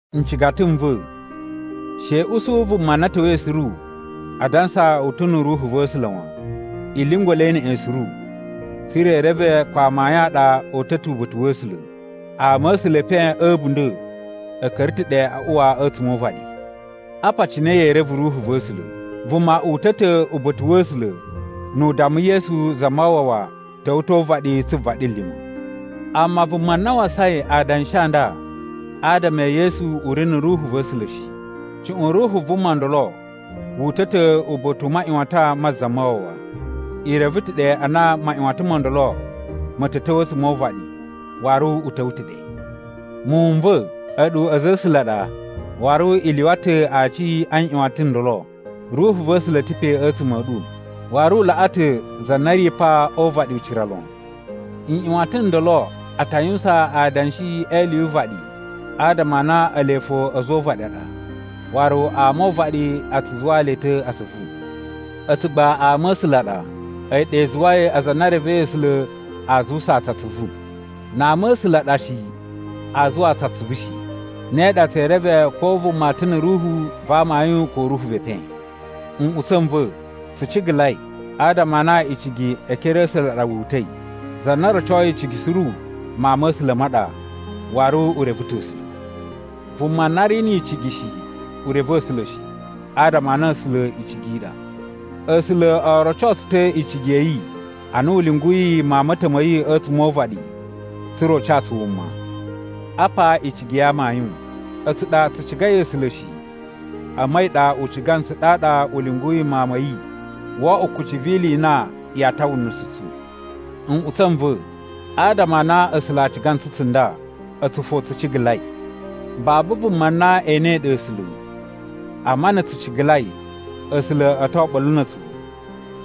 Ncigata n va̱, she i usu vuma na ta̱wa̱i suru a dansa u ta̱ na̱ Ruhu va̱ A̱sula̱ wan. I lyungwa̱ le neꞌen suru, tsa̱ra̱ i reve ko amayun a ɗa o uta̱ ta̱ uba̱ta̱ wa̱ A̱sula̱. Ama a̱ A̱sula̱ e epen a̱ a̱bunda̱ a̱ ka̱ra̱ ta̱ ɗe a uwa a̱tsuma̱ o uvaɗi. Apa cine yee reve Ruhu va̱ A̱sula̱: Vuma uta̱ ta̱ uba̱ta̱ wa̱ A̱sula̱ nu u damma Yesu Zamawawa ta̱wa̱ ta̱ o uvaɗi tsu vaɗilima̱. Amma vuma na wasain adanshi a nda a adama e Yesu u ri na̱ Ruhu va̱ A̱sula̱ shi. Cuꞌun ruhu vuma ndolo wu uta̱ ta̱ uba̱ta̱ u maꞌyuwatan ma̱ Zamawawa. I reve ta̱ ɗe a na maꞌyuwatan mo ndolo ma̱ ta̱ ta̱wa̱ a̱tsuma̱ o uvaɗi, waru u ta̱wa̱ ta̱ ɗe. Muwun n va̱, a̱ɗu a̱za̱ a̱ A̱sula̱ a ɗa, waru i lyuwa ta̱ aci a nꞌyuwatan n ndolo. Ruhu va̱ A̱sula̱ ta̱ pe a̱tsuma̱ a̱ ɗu, waru u laꞌa ta̱ za na ri pa o uvaɗi ucira lon. Nꞌyuwatan n ndolo a ta yuwusan adanshi e ili yu uvaɗi adama a na ele fo a̱za̱ o uvaɗi a ɗa, waru ama o uvaɗi a tsu zuwaa le ta̱ atsuvu. A̱tsu gba ama a̱ A̱sula̱ a ɗa, a̱yi ɗa i zuwai aza a na e revei A̱sula̱ aa zuwusaa tsu atsuvu. Na ama a̱ A̱sula̱ a ɗa shi, aa zuwaa tsu atsuvu shi. Ne ɗa tsee reve ko vuma ta̱ na̱ Ruhu va amayun ko ruhu ve epen. Nꞌutsa̱ n va̱, tsu cigalai, adama a na icigi e ekere a̱ A̱sula̱ a ɗa wu uta̱i. Za na rocoi icigi suru mawun ma̱ A̱sula̱ ma ɗa, waru u reve ta̱ A̱sula̱. Vuma na ri ni icigi shi, u reve A̱sula̱ shi, adama a na A̱sula̱ icigi i ɗa. A̱sula̱ o roco tsu ta̱ icigi ya̱ yi ana u lyunguyi Mawun ma̱ ta̱ ma̱ yi a̱tsuma̱ o uvaɗi tsa̱ra̱ u ca tsu wuma. Apa icigi ya amayun: A̱tsu ɗa tsu cigai A̱sula̱ shi, amma a̱yi ɗa u ciga ntsu ɗaɗa u lyunguyi Mawun ma̱ yi wo oꞌwo kucci vi ili i na yaa tawa nusu tsu. Nꞌutsa̱ n va̱, adama a na A̱sula̱ a ciga ntsu tsunda, a̱tsu fo tsu cigalai. Babu vuma na enei ɗe A̱sula̱, amma na̱ tsu cigalai, A̱sula̱ a̱ to oɓolo na̱ a̱tsu,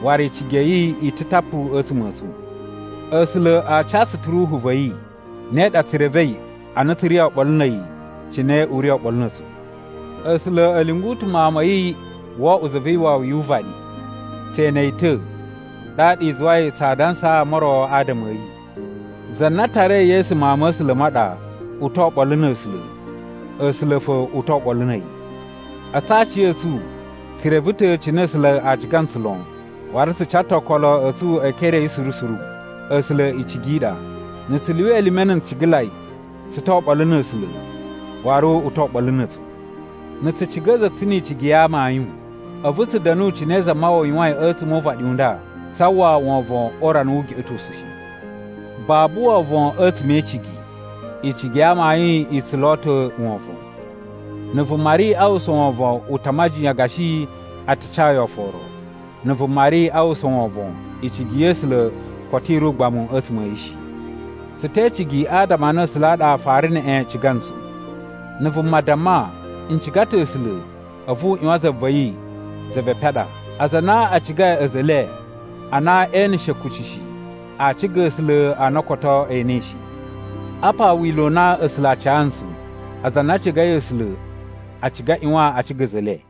waru icigi ya̱ yi i ta̱ tapu a̱tsuma̱ a̱ tsu. A̱sula̱ a ca tsu ta̱ Ruhu va̱ yi. Ne ɗa tsu revei a na tsu ri oɓolo na̱ a̱yi cine u ri oɓolo na̱ a̱tsu. A̱sula̱ a̱ lyungu ta̱ Mawun ma̱ yi wo oꞌwo Za vi Iwawi yu uvaɗi. Tse ene yi ta̱, ɗaɗa i zuwai tsaa dansaa ama o ro adama a̱ yi. Za na tarai Yesu Mawun ma̱ A̱sula̱ ma ɗa, u to oɓolo na̱ A̱sula̱, A̱sula̱ fo u to oɓolo na̱ a̱yi. A̱tsu aciya̱tsu tsu reve ta̱ cine A̱sula̱ a ciga ntsu lon, waru tsu ca ta̱ okolo a̱ tsu e ekere a̱ yi suru suru. A̱sula̱ icigi i ɗa. Na̱ tsu lyuwa elime na̱ ncigalai, tsu to oɓolo na̱ A̱sula̱, waru u to oɓolo na̱ a̱tsu. Na̱ tsu ciga a̱za̱ a̱ tsu ni icigi ya amayun, a̱vu tsu da̱nu cine Zamawawa yuwain a̱tsuma̱ o uvaɗi u nda, tsaa uwwa wovon o urana wu ugeꞌetosu shi. Babu wovon a̱tsuma̱ e icigi, icigi ya amayun i tsu lo ta̱ wovon. Na̱ vuma ri a uwwusa wovon u ta majiyan gashi a ta ca yi oforo. Na̱ vuma ri a uwwusa wovon, icigi ya̱ A̱sula̱ koto i ri ugbamu a̱tsuma̱ a̱ yi shi. Tsu te icigi adama a na A̱sula̱ a ɗa a fara neꞌen ciga ntsu. Na̱ vuma damma, “N ciga ta̱ A̱sula̱,” a̱vu u ꞌyuwan za va̱ yi, za ve epen a ɗa. Aza a na a cigai a̱za̱ e le a na e eneshe kuci shi, aa ciga A̱sula̱ a na koto e enei shi. Apa wila̱ u na A̱sula̱ a ca ntsu: aza a na a cigai A̱sula̱ a ciga a ꞌyuwan a ciga a̱za̱ e le.